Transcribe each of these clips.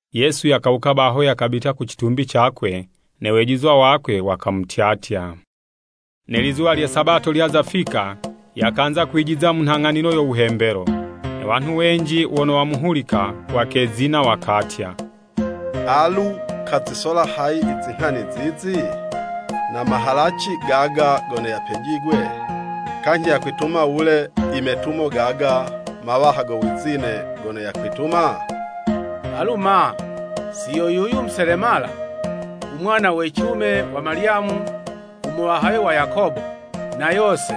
Yesu yakawuka baho yakabita ku citumbi cakwe, ne wejizwa wakwe wakamutyatya. Ne lizuwa lye Sabato lyaza fika, yakanza kwijiza mu nhang'anilo yo wuhembelo. Ne wanhu wenji wono wamuhulika wakezina, wakatya, “Alu kazisola hayi i zinghani zizi? Na mahalaci gaga gono yapejigwe? Kanyhi, yakwituma wule i metumo gaga mawaha go wizine gono yakwituma? Alu ma, si yo yuyu muselemala, umwana we cilume wa Malyamu u muwahawe wa Yakobo, na Yose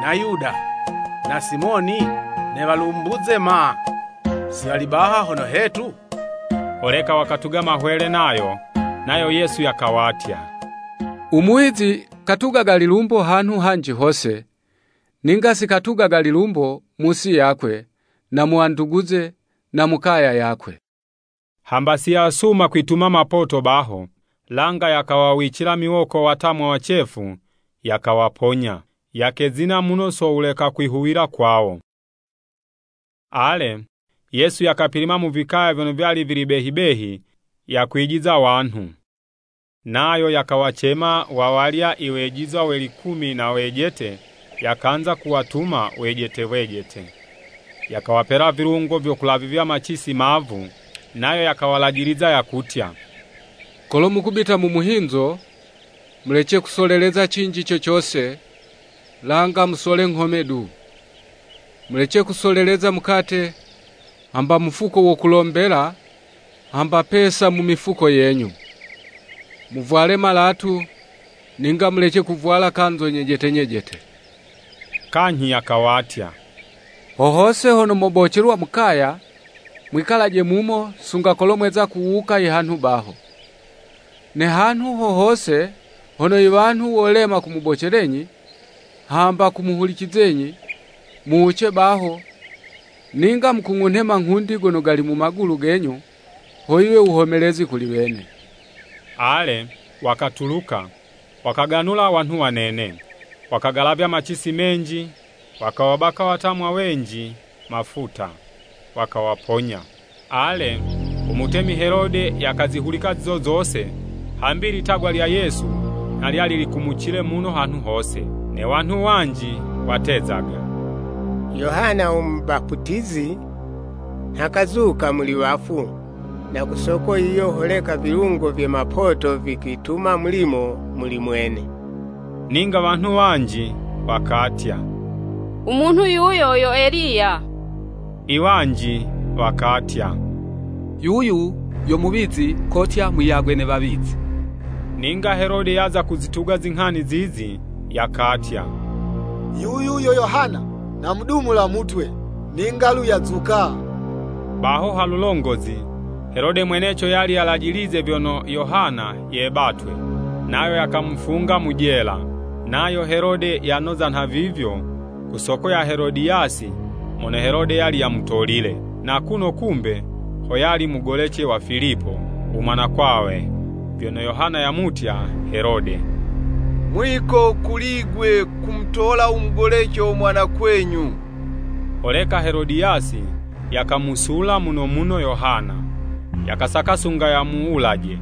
na Yuda na Simoni? Ne walumbuze ma, si wali baha hono hetu? Holeka wakatuga mahwele nayo.” Nayo Yesu yakawatya, “Umuwizi katugaga lilumbo hanhu hanji hose, ninga si katugaga lilumbo mu'si yakwe, na mu wanduguze na mu kaya yakwe.” Hamba siyasuma kwituma mapoto baho, langa yakawawicila miwoko watamwa wacefu, yakawaponya. Yakezina muno so wuleka kwihuwila kwawo. Ale, Yesu yakapilima mu vikaya vyono vyali vili behi behi, yakwijiza wanhu. Nayo yakawacema wawalya i wejizwa we likumi na wejete, yakanza kuwatuma wejete wejete. Yakawapela vilungo vyo kulavizya macisi mavu, nayo yakawalajiliza yakutya, “Kolo mukubita mu muhinzo, mulece kusoleleza cinji co cose, langa musole nghome du. Mulece kusoleleza mukate, hamba mufuko wo kulombela, hamba pesa mu mifuko yenyu. Muvwale malatu, ninga mulece kuvwala kanzo nyejete nyejete.” Kanyhi yakawatya, “Ho hose hono mobocelwa mu kaya, mwikalaje mumo, sunga kolo mweza kuwuka i hanhu baho. Ne hanhu ho hose hono iwanhu wolema kumubocelenyi hamba kumuhulicenyi, muwuce baho, ninga mukung'unhe manghundi gono gali mu magulu genyu, ho yiwe wuhomelezi kuli wene.” Ale, wakatuluka, wakaganula wanhu wanene. Wakagalavya macisi menji, wakawabaka watamwa wenji mafuta, wakawaponya. Ale, umutemi Helode yakazihulika zizo zose, hambi ilitagwa lya Yesu nha lyali likumucile muno hanhu hose. Ne wanhu wanji watezaga, “Yohana Umubaputizi nha kazuka muli wafu, na ku soko yiyo holeka ivilungo vye mapoto vikwituma mulimo muli mwene.” Ninga wanhu wanji wakatya, “Umunhu yuyo yo Eliya.” Iwanji wakatya, “Yuyu yo muwizi kotya muyagwe ne wawizi.” Ninga Helode yaza kuzituga zinghani zizi, yakatya, “Yuyu yo Yohana! Namudumula mutwe, ninga'lu yazuka.” Baho halulongozi, Helode mweneco yali yalajilize vyono Yohana yebatwe, nayo yakamufunga mu jela. Nayo Helode, yanoza nhavivyo, ku soko ya Helodiyasi mono Helode yali yamutolile, na kuno kumbe ho yali mugolece wa Filipo, u mwanakwawe. Vyono Yohana yamutya, Helode, “Mwiko kuli'gwe kumutola u mugolece wo mwanakwenyu.” Holeka Helodiyasi yakamusula muno muno Yohana, yakasaka sunga yamuwulaje,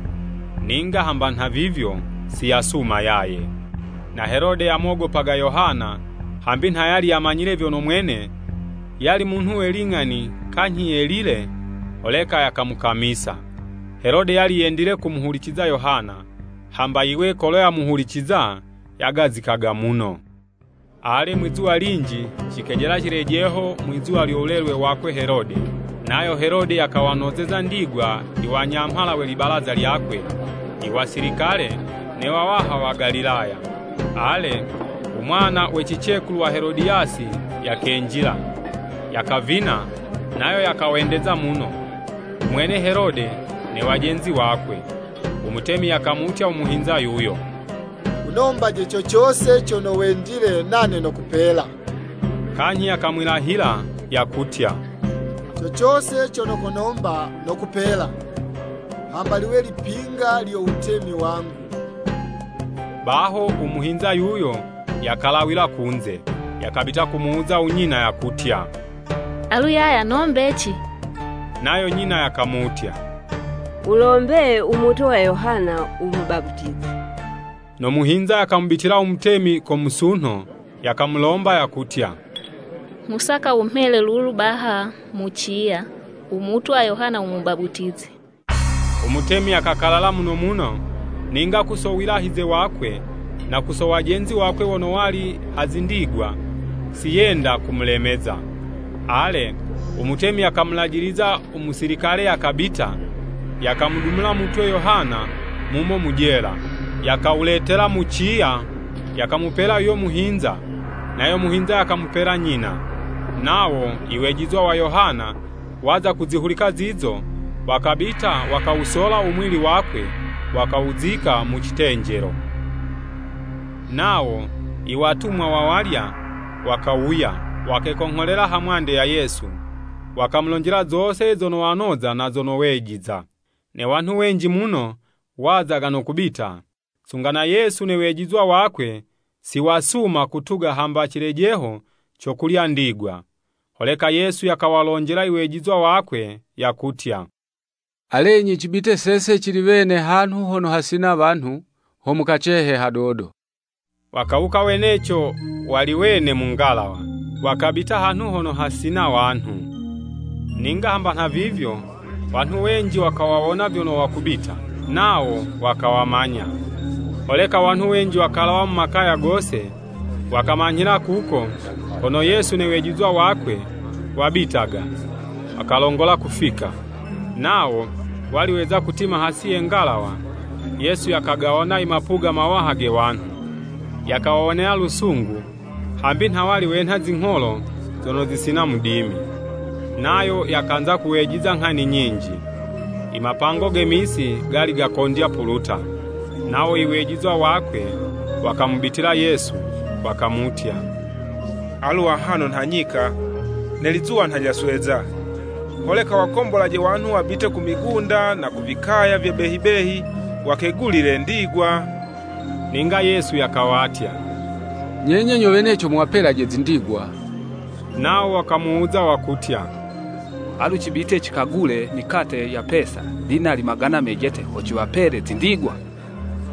ninga hamba nhavivyo, siyasuma yaye. Na Helode yamogopaga Yohana, hambi nha yali yamanyile vyono mwene yali munhu we ling'ani kanyhi yelile, holeka yakamukamisa. Helode yali yendile kumuhuliciza Yohana, hamba yiwe kolo yamuhuliciza, yagazikaga muno. Ale, mwizuwa linji, cikejela cilejeho, mwizuwa lyo wulelwe wakwe Helode. Nayo Helode yakawanozeza ndigwa iwanyamhala we libalaza lyakwe, iwasilikale ne wawaha wa Galilaya. Ale, umwana we cicekulu wa Helodiyasi yakenjila, yakavina, nayo yakawendeza muno, umwene Helode ne wajenzi wakwe. Umutemi yakamutya u muhinza yuyo “Wunombaje co cose cono wendile nane nokupela.” Kanyhi yakamwilahila, yakutya, “Co cose cono konomba, nokupela, hamba liwe lipinga lyo wutemi wangu.” Baho u muhinza yuyo yakalawila kunze, yakabita kumuwuza unyina yakutya, “Alu yaya, nombeci!” Nayo nyina yakamutya, wulombe “Umutwe wa Yohana u Mubaputizi.” No muhinza yakamubitila umutemi ko musunho, yakamulomba yakutya, “Nghusaka wumhele lulu baha mu ciya, umutwe wa Yohana u Mubaputizi.” Umutemi yakakalala muno muno, ninga ku so wilahize wakwe, na ku so wajenzi wakwe wono wali ha zindigwa, siyenda kumulemeza. Ale, umutemi yakamulajiliza umusilikale yakabita, yakamudumula mutwe Yohana mumo mu jela, Yakawuletela mu ciya, yakamupela yuyo muhinza, nayo muhinza yakamupela nyina. Nawo Iwejizwa wa Yohana, waza kuzihulika zizo, wakabita wakawusola u muwili wakwe, wakawuzika mu citenjelo. Nawo iwatumwa wawalya, wakawuya, wakekongholela ha mwande ya Yesu, wakamulonjela zose zono wanoza na zono wejiza. Ne wanhu wenji muno wazaga no kubita, sunga na Yesu ne wejizwa wakwe siwasuma kutuga hamba cilejeho co kulya ndigwa. Holeka Yesu yakawalonjela iwejizwa wakwe yakutya, “Alenyi cibite sese cili wene hanhu hono hasina wanhu, ho mukacehe hadodo.” Wakawuka weneco wali wene mu ngalawa, wakabita hanhu hono hasina wanhu. Ninga hamba nhavivyo, wanhu wenji wakawawona vyono wakubita, nawo wakawamanya. Holeka wanhu wenji wakalawa mu makaya gose, wakamanyhila kuko kono Yesu ne wejizwa wakwe wabitaga, wakalongola kufika. Nawo wali weza kutima hasi ye ngalawa, Yesu yakagawona i mapuga mawaha ge wanhu, yakawawonela lusungu, hambi nha wali wenha zingholo zono zisina mudimi. Nayo yakanza kuwejiza nghani nyinji. Imapango ge misi gali gakondya puluta. Nawo iwejizwa wakwe wakamubitila Yesu, wakamutya, “Alu ahano nha nyika, ne lizuwa nha lyasweza. Holeka wakombolaje wanhu wabite ku migunda na ku vikaya vye behi behi, wakegulile ndigwa.” Ninga Yesu yakawatya, “Nyenye nyo weneco muwapelaje zindigwa.” Nawo wakamuwuza wakutya, “Alu cibite cikagule mikate ya pesa, dinali magana mejete, ho ciwapele zindigwa?”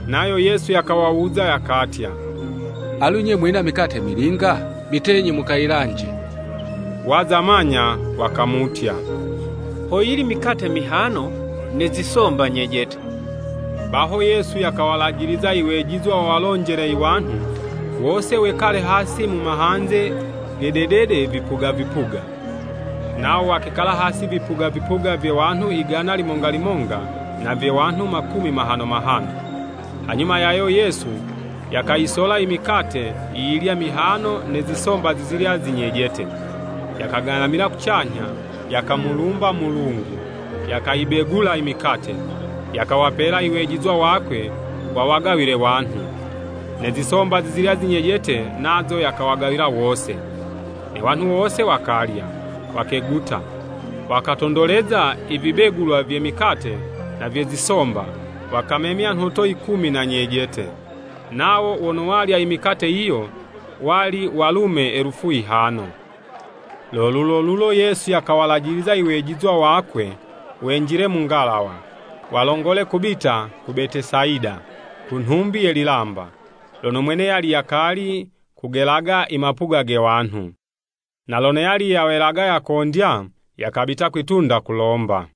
Nayo Yesu yakawawuza, yakatya, “Alu 'nye mwina mikate milinga?” Bitenyi mukayilanje. Waza manya wakamutya, “Hoyili mikate mihano ne zisomba nyejete.” Baho, Yesu yakawalajiliza iwejizwa wawalonjele iwanhu wose wekale hasi mu mahanze ge dedede vipuga vipuga. Nawo wakekala hasi vipuga vipuga vya wanhu igana limonga limonga, na vye wanhu makumi mahano mahano. Hanyuma yayo Yesu yakayisola i mikate yiyilya mihano ne zisomba zizilya zinyejete, yakagalamila kucanyha, yakamulumba Mulungu, yakayibegula i mikate, yakawapela i wejizwa wakwe wawagawile wanhu. Ne zisomba zizilya zinyejete nazo yakawagawila wose. Ne wanhu wose wakalya, wakeguta. Wakatondoleza ivibegulwa vye mikate na vye zisomba, wakamemya nhoto yikumi na nyejete. Nawo wono walya i mikate yiyo, wali walume elufu yihano. Lo lulolulo Yesu yakawalajiliza iwejizwa wakwe wenjile mu ngalawa, walongole kubita ku Betesayida, ku nhumbi ye lilamba, lono mwene yali yakali kugelaga i mapuga ge wanhu. Na lono yali yawelaga yakondya, yakabita kwi'tunda kulomba.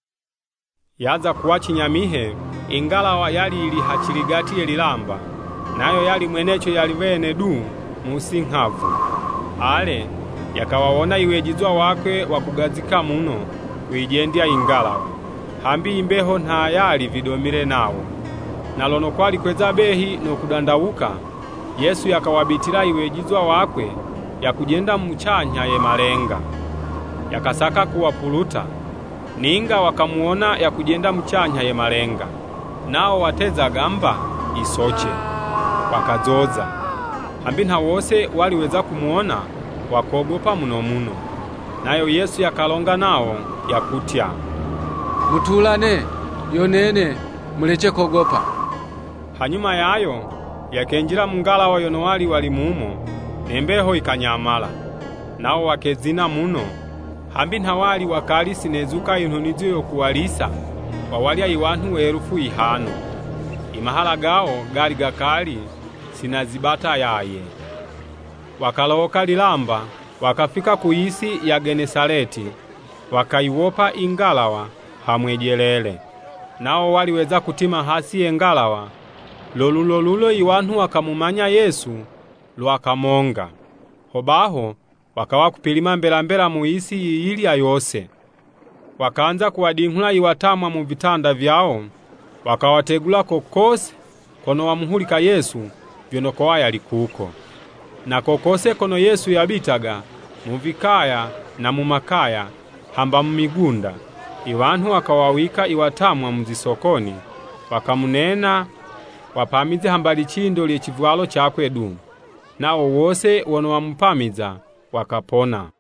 Yaza kuwa cinyamihe i ngalawa yali yili ha ciligati ye lilamba, nayo yali mweneco yali wene du mu'si nghavu. Ale, yakawawona iwejizwa wakwe wakugazika muno kuyijendya ingalawa, hambi imbeho nha yali vidomile nawo. Na lono kwali kweza behi no kudandawuka, Yesu yakawabitila i wejizwa wakwe yakujenda mucanyha ye malenga. Yakasaka kuwapuluta. Ninga wakamuwona yakujenda mucanyha ye malenga, nawo watezaga mba yisoce, wakazoza. Hambi nha wose wali weza kumuwona, wakogopa muno muno. Nayo Yesu yakalonga nawo, yakutya, “Mutulane, yo nene, mulece kogopa!” Hanyuma yayo, yakenjila mu ngalawa yono wali wali mumo, ne mbeho yikanyamala. Nawo wakezina muno, hambi nha wali wakali sinezuka inhunizo yo kuwalisa wawalya i wanhu we elufu yihano. I mahala gawo gali gakali si nazibata yaye. Wakalowoka lilamba, wakafika kuyisi ya Genesaleti, wakayiwopa ingalawa ha mwejelele. Nawo wali weza kutima hasi ye ngalawa, lo lulolulo iwanhu wakamumanya Yesu lwa kamonga. Hobaho wakawa kupilima mbela mbela muyisi yiyilya yose, wakanza kuwadinghula iwatamwa mu vitanda vyawo, wakawategula ko kose, kono wamuhulika Yesu vyono kowa yali kuko. Na ko kose kono Yesu yabitaga, mu vikaya na mu makaya, hamba mu migunda, iwanhu wakawawika iwatamwa mu zisokoni, wakamunena wapamize hamba licindo lye civwalo cakwe du. Nawo wose wono wamupamiza, wakapona.